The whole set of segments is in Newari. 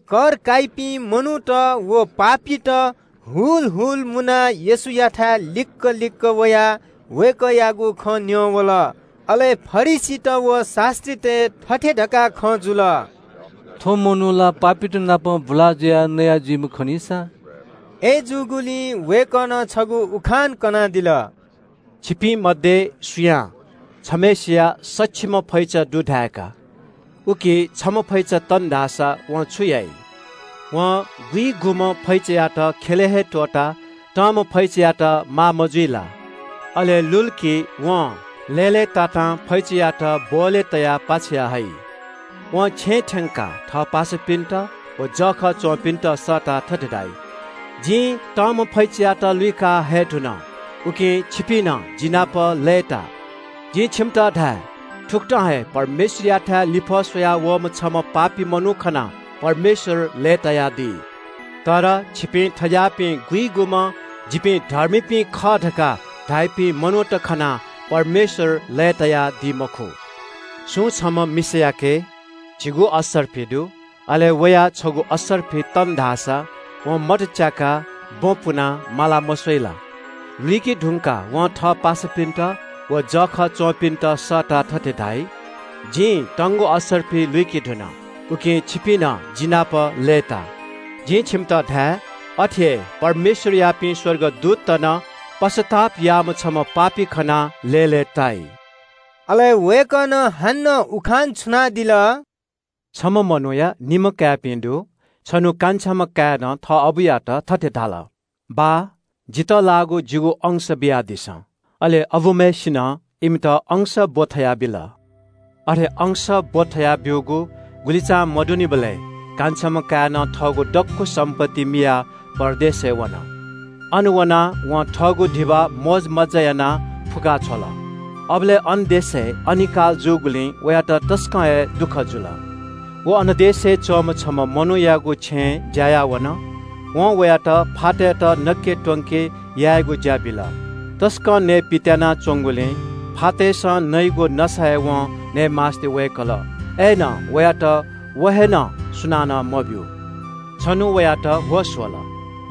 कर काइपिं मनूत व पापीत हुल हुल मुनाः येशूयाथाय् लिक्‍क लिक्‍क वयाः वय्‌कःयागु खँ न्‍यं वल। अले फरिसीत व शास्‍त्रीतय् थथे धकाः खँ जुल – “थ्‍व मनू ला पापीत नाप बुला जुयाः नया जुइम्‍ह खनिसा।” अय्‌जूगुलिं वय्‌कलं छगू उखान कनादिल। “छिकपिं मध्‍ये सुयां छम्‍हय्‌सिया सछिम्‍ह फैचा दु धाय्‌का। उकी छम्‍ह फैचा तन धाःसा वं छु याइ? वं गुइगुम्‍ह फैचायात ख्‍यलय् हे त्‍वःताः तंम्‍ह फैचायात माः मजुइ ला? अले लुल कि वं लय्‌लय्‌तातां फैचायात ब्‍वहलय् तयाः हइ। वं छेँ थ्‍यंकाः थः पासापिन्‍त व जःखः च्‍वंपिन्‍त सःताः थथे धाइ – ‘जिं तंम्‍ह फैचायात लुइका हये धुन, उकिं छिपिं नं जिनापं लय्‌ता।’ जिं छिकपिन्‍त धाये – थुकथं हे पश्‍चाताप याःम्‍ह छम्‍ह पापी मनू खनाः परमेश्‍वर लय्‌तायादी। तर छिकपिं थें ज्‍याःपिं गुइगुम्‍ह ‘जिपिं धर्मीपिं खः’ धकाः धाइपिं मनूत खनाः परमेश्‍वर लय्‌तायादी मखु।” “सुं छम्‍ह मिसायाके झिगू पाँय् म्‍वहः दु। अले वया छगू पाँय् म्‍वहः तन धाःसा वं मत च्‍याकाः बँ पुनाः मालाः मस्‍वइ ला? लुइके धुंकाः वं थः पासापिन्‍त व जःखः च्‍वंपिन्‍त सःताः थथे धाइ – ‘जिं तंगु पाँय् म्‍वहः लुइके धुन, उकिं छिपिं नं जिनापं लय्‌ता।’ जिं छिकपिन्‍त धाये – अथे हे परमेश्‍वरयापिं स्‍वर्गदूतत नं पश्‍चाताप याःम्‍ह छम्‍ह पापी खनाः लय्‌लय्‌ताइ।” अले वय्‌कलं हानं उखान छुनादिल – “छम्‍ह मनूया निम्‍ह काय्‌पिं दु। छन्‍हु कान्छाम्‍ह काय्‌नं थः अबुयात थथे धाल – ‘बाः, जितः जिगु अंश बियादिसँ।’ अले अबुम्‍हय्‌सिनं निम्‍ह काय्‌पिन्‍त अंश इनाबिल। “अथे अंश इनाब्‍यूगु गुलिचां मदुनिबलय् कान्छाम्‍ह काय्‌नं थःगु दक्‍व सम्‍पत्ति मियाः परदेशय् वन। अन वनाः वं थःगु धिबा मोजमज्‍जा यानाः फुक्‍का छ्वत। अबलय् अन देशय् अनिकाल जूगुलिं वयात तसकं हे दुःख जुल। व अन देशय् च्‍वंम्‍ह छम्‍ह मनूयागु छेँय् ज्‍या याः वन। वं वयात फातय्‌त नके त्‍वंके यायेगु ज्‍या बिल। तसकं नयेपित्‍यानाः च्‍वंगुलिं फातय्‌सं नइगु नसा हे वं नये मास्‍ति वय्‌कल, अय्‌नं वयात व हे नं सुनानं मब्‍यू। “छन्‍हु वयात होश वल,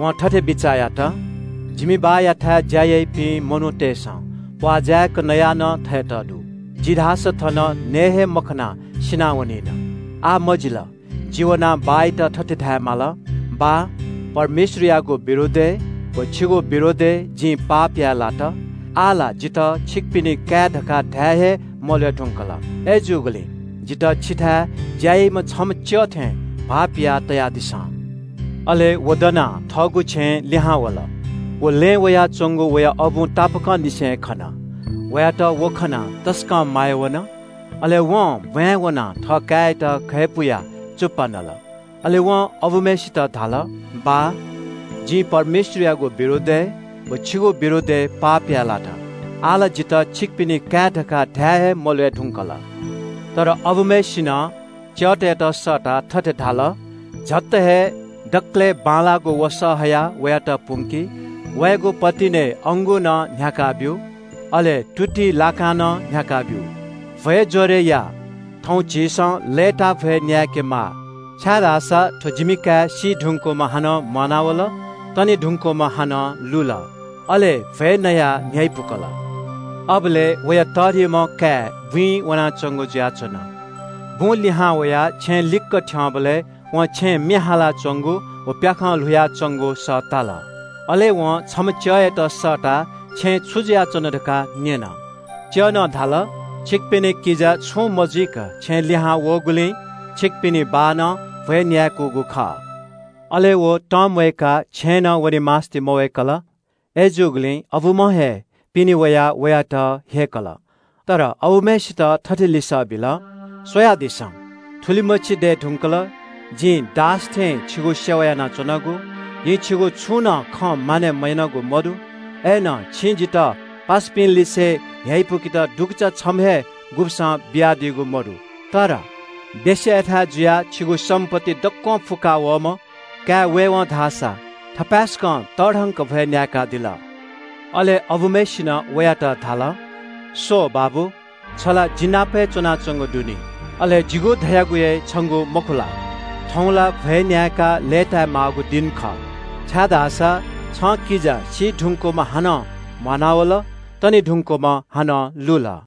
वं थथे बिचाः यात – ‘जिमि बाःयाथाय् ज्‍या याइपिं मनूतय्‌सं प्‍वाः जाय्‌क नयाः नं थयेत दु, जि धाःसा थन नये हे मखनाः सिनावनिन। आः मजिल, जि वनाः बाःयात थथे धायेमाल – “बाः, परमेश्‍वरयागु विरोधय् व छिगु विरोधय् जिं पाप याये लात। आः ला जितः छिकपिनि काय् धकाः धाये हे मल्‍वय् धुंकल। अय्‌जूगुलिं जितः छिथाय् ज्‍या याइम्‍ह छम्‍ह च्‍यः थें भाःपिया तयादिसँ।”’ “अले व दनाः थःगु छेँय् लिहां वल। व लँय् वयाच्‍वंगु वया अबुं तापाकंनिसें हे खन। वयात खनाः तसकं माया वन। अले ब्‍वाँय् वनाः थःकाय्‌यात घय्‌पुयाः चुप्‍पा नल। अले वं अबुम्‍हय्‌सित धाल – ‘बाः, जिं परमेश्‍वरयागु विरोधय् व छिगु विरोधय् पाप याये लात। आः ला जितः छिकपिनि काय् धकाः धाये हे मल्‍वय् धुंकल।’ “तर अबुम्‍हय्‌सिनं च्‍यःतय्‌त सःताः थथे धाल – ‘याकनं हे दकलय् बांलाःगु वसः हयाः वयात पुंकि। वयागु पतिनय् अंगू नं न्‍ह्याकाः ब्‍यु। अले तुतिइ लाकां नं न्‍ह्याकाः ब्‍यु। भ्‍वय् ज्‍वरय् या। थौं झीसं लय्‌ताः भ्‍वय् न्‍याय्‌केमाः, छाय्‌धाःसा थ्‍व जिमि काय् सी धुकूम्‍ह हानं म्‍वानावल, तने धुंकूम्‍ह हानं लुल।’ अले भ्‍वय् नयाः न्‍ह्यइपुकल।” “अबलय् वया तःधिकःम्‍ह काय् बुँइ वनाच्‍वंगु जुयाच्‍वन। बुं लिहां वयाः छेँ लिक्‍क थ्‍यंबलय् वं छेँय् म्‍ये हालाच्‍वंगु व प्‍याखं ल्‍हुयाच्‍वंगु सः ताल। अले वं छम्‍ह च्‍यःयात सःताः छेँय् छु जुयाच्‍वन धकाः न्‍यन। च्‍यलं धाल – ‘छिकपिनि किजा छुं मजुइक छेँय् लिहां वःगुलिं छिकपिनि बाःनं भ्‍वय् न्‍याय्‌कूगु खः।’ “अले व तसकं तंम्‍वय्‌काः छेँय् नं वने मास्‍ति मवय्‌कल। अय्‌जूगुलिं अबुम्‍हं हे पिने वयाः वयात ह्यय्‌कल। तर अबुम्‍हय्‌सित थथे लिसः बिल – ‘स्‍वयादिसँ, थुलिमछि दये धुंकल जिं दास थें छिगु सेवा यानाच्‍वनागु। जिं छिगु छुं नं खँ मानय् मयानागु मदु। अय्‌नं छिं जितः पासापिंलिसे न्‍ह्यइपुकेत दुगुचा छम्‍ह हे गुब्‍सं बियादीगु मदु। वेश्‍यायाथाय् जुयाः छिगु सम्‍पत्ति दक्‍वं फुक्‍का वःम्‍ह काय् वयेवं धाःसा थपाय्‌सकं तःधंक भ्‍वय् न्‍याय्‌कादिल।’ “अले अबुम्‍हय्‌सिनं वयात धाल – ‘स्‍व बाबु, छ ला जि नाप हे च्‍वनाच्‍वंगु दु नि। अले जिगु धयागु हे छंगु मखु ला? थौं ला भ्‍वय् न्‍याय्‌काः लय्‌ताय् माःगु दिं खः, छाय्‌धाःसा छं किजा सी धुंकूम्‍ह हानं म्‍वानावल, तने धुंकूम्‍ह हानं लुल।’”